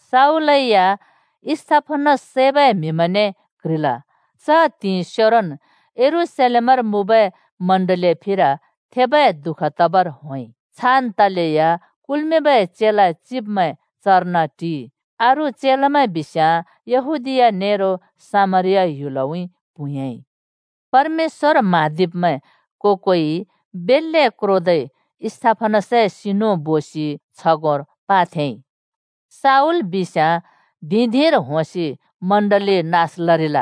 शाऊल या स्तिफनस सैबै म्हिमैंने क्ह्रिल। च त्हिंइ सेरोन् यरूशलेमर मुँबै चर्चए फिर थेबै दुःख तबर होंइ। छान् तलेया कुल्मिंबै चेला चिब्मैं चर्न टिइ। अरू चेलामैं बिस्याँ येहूदिया नेरो सामरिया ह्‍युलउँइँ प्हुँयाँइ। परमेश्‍वर म्हाँदिब्मैं को-कोइ बेल्‍ले क्रोदै स्तिफनसए सिनु बोसि छगोंर पाथेंइ। शाऊल बिस्याँ धिं-धिंर होंसि चर्च नास लरिल।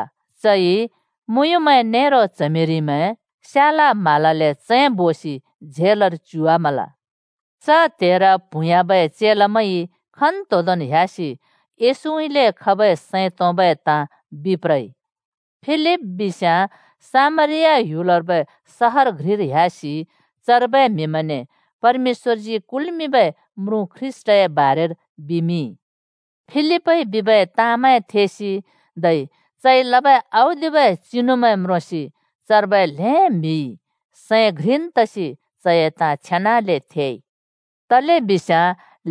चइ मुँयुँमैं नेरो च्हमिरिमैं स्याला म्हालाले चैंबोसि झेलर च्युवामाल। च त्हेर प्हुँयाँबै चेलामैंइ खन्तोंदोंन् ह्‍यासि येशूउँइँले खबै सैं तोंबै ताँ बिप्रइ। फिलिप बिस्याँ सामरिया ह्‍युलर्बै सहर घ्रिर ह्‍यासि चर्बै म्हिमैंने परमेश्‍वरजी कुल्मिंबै म्रुँ ख्रीष्‍टए बारेर बिमिंइ। फिलिपइ बिबै ताँमैं थेसि, धै चइ लबै औदिबै चिनुमैं म्रोंसि, चर्बै ल्हें म्हिइ सैं घ्रिन् तसि चए ताँ छेनाले थेइ। तलेबिस्याँ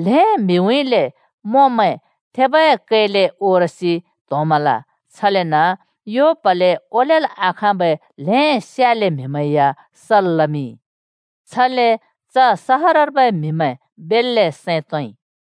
ल्हें म्हिउँइँले मोंमैं थेबै कैले ओरसि त्होंमल। छलेन यो प्हले ओलेल् आखाँबै ल्हें स्याले म्हिमैं या सल् लमिंइ। छले च सहरर्बै म्हिमैं बेल्‍ले सैं तोंइ।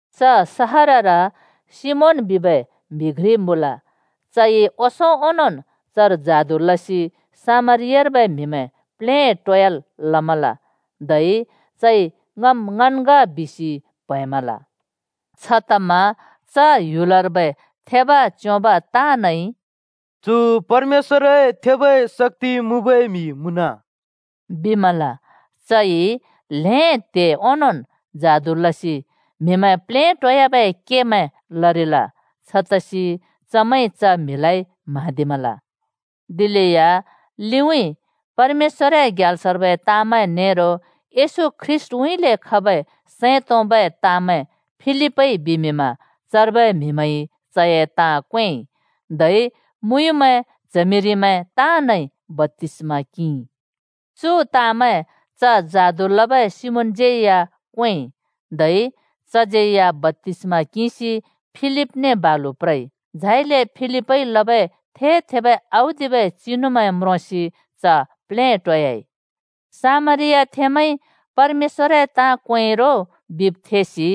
च सहरर सिमोन बिबै म्हि घ्रि मुँल। चइ ओंसों ओंनोंन् चर जादु लसि सामरियार्बै म्हिमैं प्लेटोयाल् लमल, धै चइ ङम् ङन् ग बिसि प्हैंमल। छतमा च ह्‍युलर्बै थेब च्योंब ताँनइ “चु परमेश्‍वरए थेबै शक्‍ति मुँबै म्हि मुँन!” बिमल। चइ ल्हें त्हे ओंनोंन् जादु लसि म्हिमैं प्लेटोयाबै केमैं लरिल। छतसि चमैंइ च म्हिलाइ म्हाँदिमल। दिलेया लिउँइँ परमेश्‍वरए ग्याल्सर्बै ताँमैं नेरो येशू ख्रीष्‍ट उँइँले खबै सैं तोंबै ताँमैं फिलिपइ बिमिंमा चर्बै म्हिमैंइ चए ताँ क्वेंइ, धै मुँयुँमैं, च्हमिरिमैं ताँनइ बप्‍तिस्मा किंइ। चु ताँमैं च जादु लबै सिमोनज्यै क्वेंइ, धै चज्यैया बप्‍तिस्‍मा किंसि फिलिपने बालु प्रइ। झाइले फिलिपइ लबै थे-थेबै औदिबै चिनुमैं म्रोंसि च प्लेटोयाइ। सामरियाथेंमैंइ परमेश्‍वरए ताँ क्वेंइ रो बिब् थेसि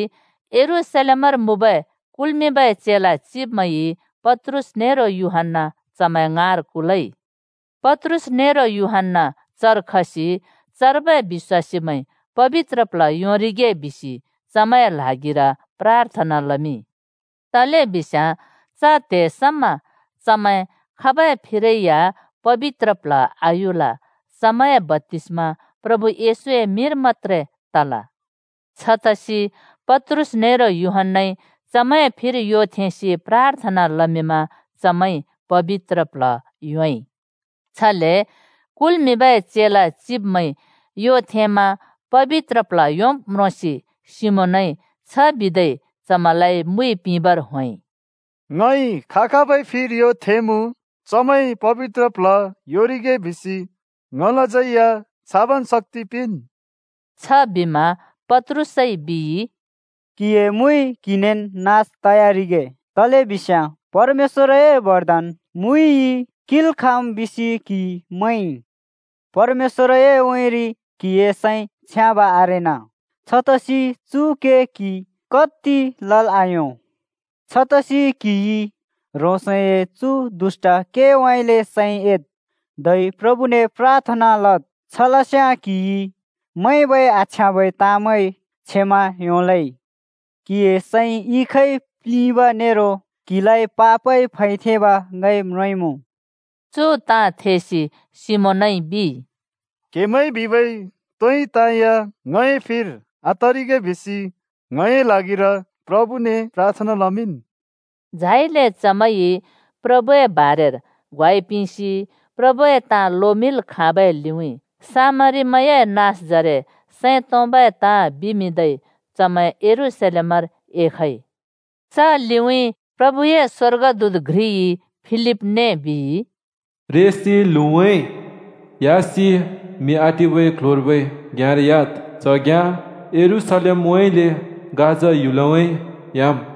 यरूशलेमर मुँबै कुल्मिंबै चेला चिब्मैंइ पत्रुस नेरो यूहन्‍ना चमैं ङाँर कुलइ। पत्रुस नेरो यूहन्‍ना चर खसि चर्बै बिश्‍वासीमैंइ पबित्र प्ल्ह योंरिगे बिसि चमैंए ल्हागिर प्राथना लमिंइ। तलेबिस्याँ च त्हे समा चमैं खाबै फिरै या पबित्र प्ल्ह आयुल। चमैंए बप्‍तिस्मा प्रभु येशूए मिंर मत्‍त्रे तल। छतसि पत्रुस नेरो यूहन्‍नाइ चमैंए फिर यो थेंसि प्राथना लमिंमा चमैंइ पबित्र प्ल्ह योंइ। छले कुल्मिंबै चेला चिब्मैंइ यो थेंमा पबित्र प्ल्ह योंब् म्रोंसि सिमोनइ छ बिदै चमैंलाइ मुइ पिंबर होंइ, “ङइ खा-खाबै फिर यो थेंमुँ चमैंइ पबित्र प्ल्ह योंरिगे बिसि ङलाज्यै या छाबन् शक्‍ति पिंन्।” छबिमा पत्रुसइ बिइ, “क्‍हिए मुइ क्हिनेन् नास तयारिगे, तलेबिस्याँ परमेश्‍वरए बरदान मुइइ किंल् खाँम् बिसि क्हिइ मैंइ! परमेश्‍वरए उँइँरि क्हिए सैं छ्याँब आरेना। छतसि चु के क्हिइ कति लल् आयों! छतसि क्हिइ ह्रोंसए चु दुष्‍ट केउँइँले सैं एद् धै प्रभुने प्राथना लद्, छलस्याँ क्हिइ मैंबै आछ्याँबै ताँमैं क्षमा योंलै। क्हिए सैं इखइ प्लिंब नेरो क्हिलाइ पापइ फैथेंब ङइ म्रोंइँमुँ।” चु ताँ थेसि सिमोनइ बिइ, “क्हेमैंइ बिबै तोइ ताँ या ङए फिर आतरिगे बिसि, ङए ल्हागिर प्रभुने प्राथना लमिंन्।” झाइले चमैंइ प्रभुए बारेर ग्वाइ पिंसि प्रभुए ताँ लोमिंल् खाँबै लिउँइँ सामरीमैंए नाँसजरे सैं तोंबै ताँ बिमिंदै चमैं यरूशलेमर एखइ। च लिउँइँ प्रभुए स्वर्गदूत घ्रिइ फिलिपलाइ बिइ, “रेसि ल्हुँउँइँ (दक्षिण) ह्‍यासि म्हि आटिबै क्ल्ह्‍योर्बै घ्याँर ह्‍याद्। च घ्याँ यरूशलेमउँइँले गाजा ह्‍युलउँइँ ह्‍याम्।”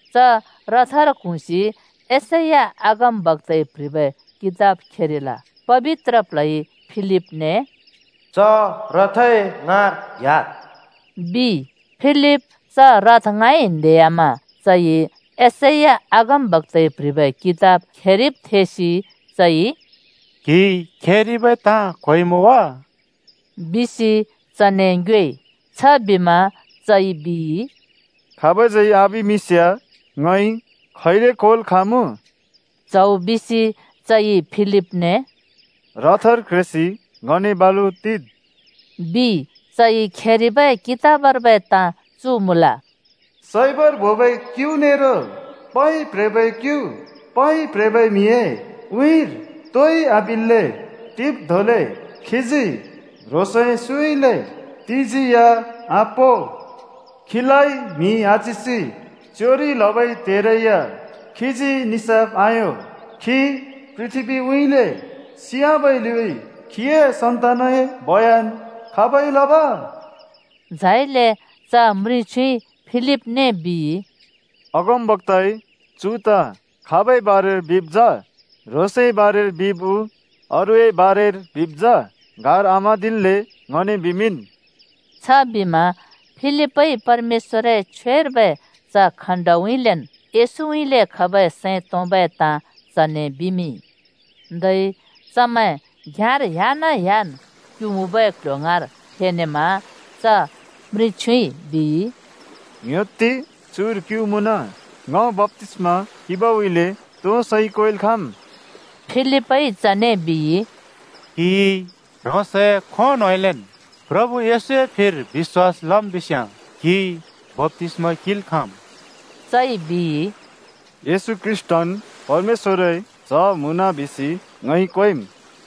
च रथर क्हुँसि यशैया अगमबक्‍ताइ प्ह्रिबै कितब खेरिल। पबित्र प्ल्हइ फिलिपने “च रथए ङाँर ह्‍याद्,” बिइ। फिलिप च रथ ङाँइ न्हेह्‍यामा चइ यशैया अगमबक्‍ताइ प्ह्रिबै कितब खेरिब् थेसि चइ “क्हिइ खेरिबै ताँ क्होइमुँ वा?” बिसि चने ङ्योएइ। छबिमा चइ बिइ, “खाबज्यै आबिमिंस्याँ ङइ खैले क्होल् खाँमुँ?” च्हौ बिसि चइ फिलिपने “रथर क्रेसि ङने बालु टिद्,” बिइ। चइ खेरिबै कितबर्बै ताँ चु मुँल, “सैबर बोबै क्यु नेरो पै प्ह्रेबै क्यु पै प्ह्रेबै म्हिए उँइँर तोइ आबिल्‍ले टिब् धोंले, खीजी ह्रोंसए सुँउँइँले तिजी या आपों। खीलाइ म्हि आच्हिसि च्योंरि लबै त्हेरै या खीजी निसाफ आयों। खी पृथ्‍बीउँइँले सियाबै लिउँइँ खीए सन्तानए बयन खाबइ लब?” झाइले च हिचडइ फिलिपने बिइ, “अगमबक्‍ताइ चु ताँ खाबै बारेर बिब् जा? ह्रोंसए बारेर बिब् उ अरूए बारेर बिब् जा? गार आम्हाँदिल्‍ले ङने बिमिंन्।” छबिमा फिलिपइ परमेश्‍वरए छ्वेर्बै च खण्‍डउँइँलेन् येशूउँइँले खबै सैं तोंबै ताँ चने बिमिंइ। धै चमैं घ्‍याँर ह्‍याना-ह्‍यान् क्‍यु मुँबै क्‍ल्‍ह्‍यो ङाँर फेनेमा च हिचडइ बिइ, “ङ्‍ह्‍योत्ति, चुर क्यु मुँन। ङ बप्‍तिस्मा किंबउँइँले तो सैइ क्वेल् खाँम्?” [फिलिपइ चने बिइ, “क्‍हिइ ह्रोंसए खों न्होंउँइँलेन् प्रभु येशूए फिर बिश्‍वास लम् बिस्याँ क्हिइ बप्‍तिस्मा किंल् खाँम्।” चइ बिइ, “येशू ख्रीष्‍टन् परमेश्‍वरए च्ह मुँन बिसि ङइ क्वेंम्,”]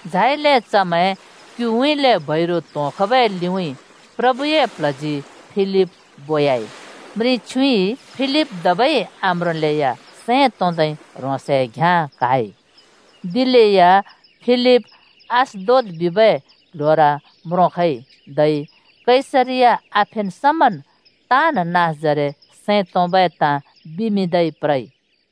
झाइले चमैं क्‍युउँइँले बैरु त्‍होंखबै लिउँइँ प्रभुए प्ल्हजी फिलिप बोयाइ। हिचडइ फिलिप धबै आम्रोंलेया सैं तोंदै ह्रोंसए घ्‍याँ क्‍हाइ। दिलेया फिलिप अश्दोद बिबै क्ल्ह्‍योर म्रोंखइ, धै कैसरिया आफेन् समन् ताँन् नाँसजरे सैं तोंबै ताँ बिमिंदै प्रइ।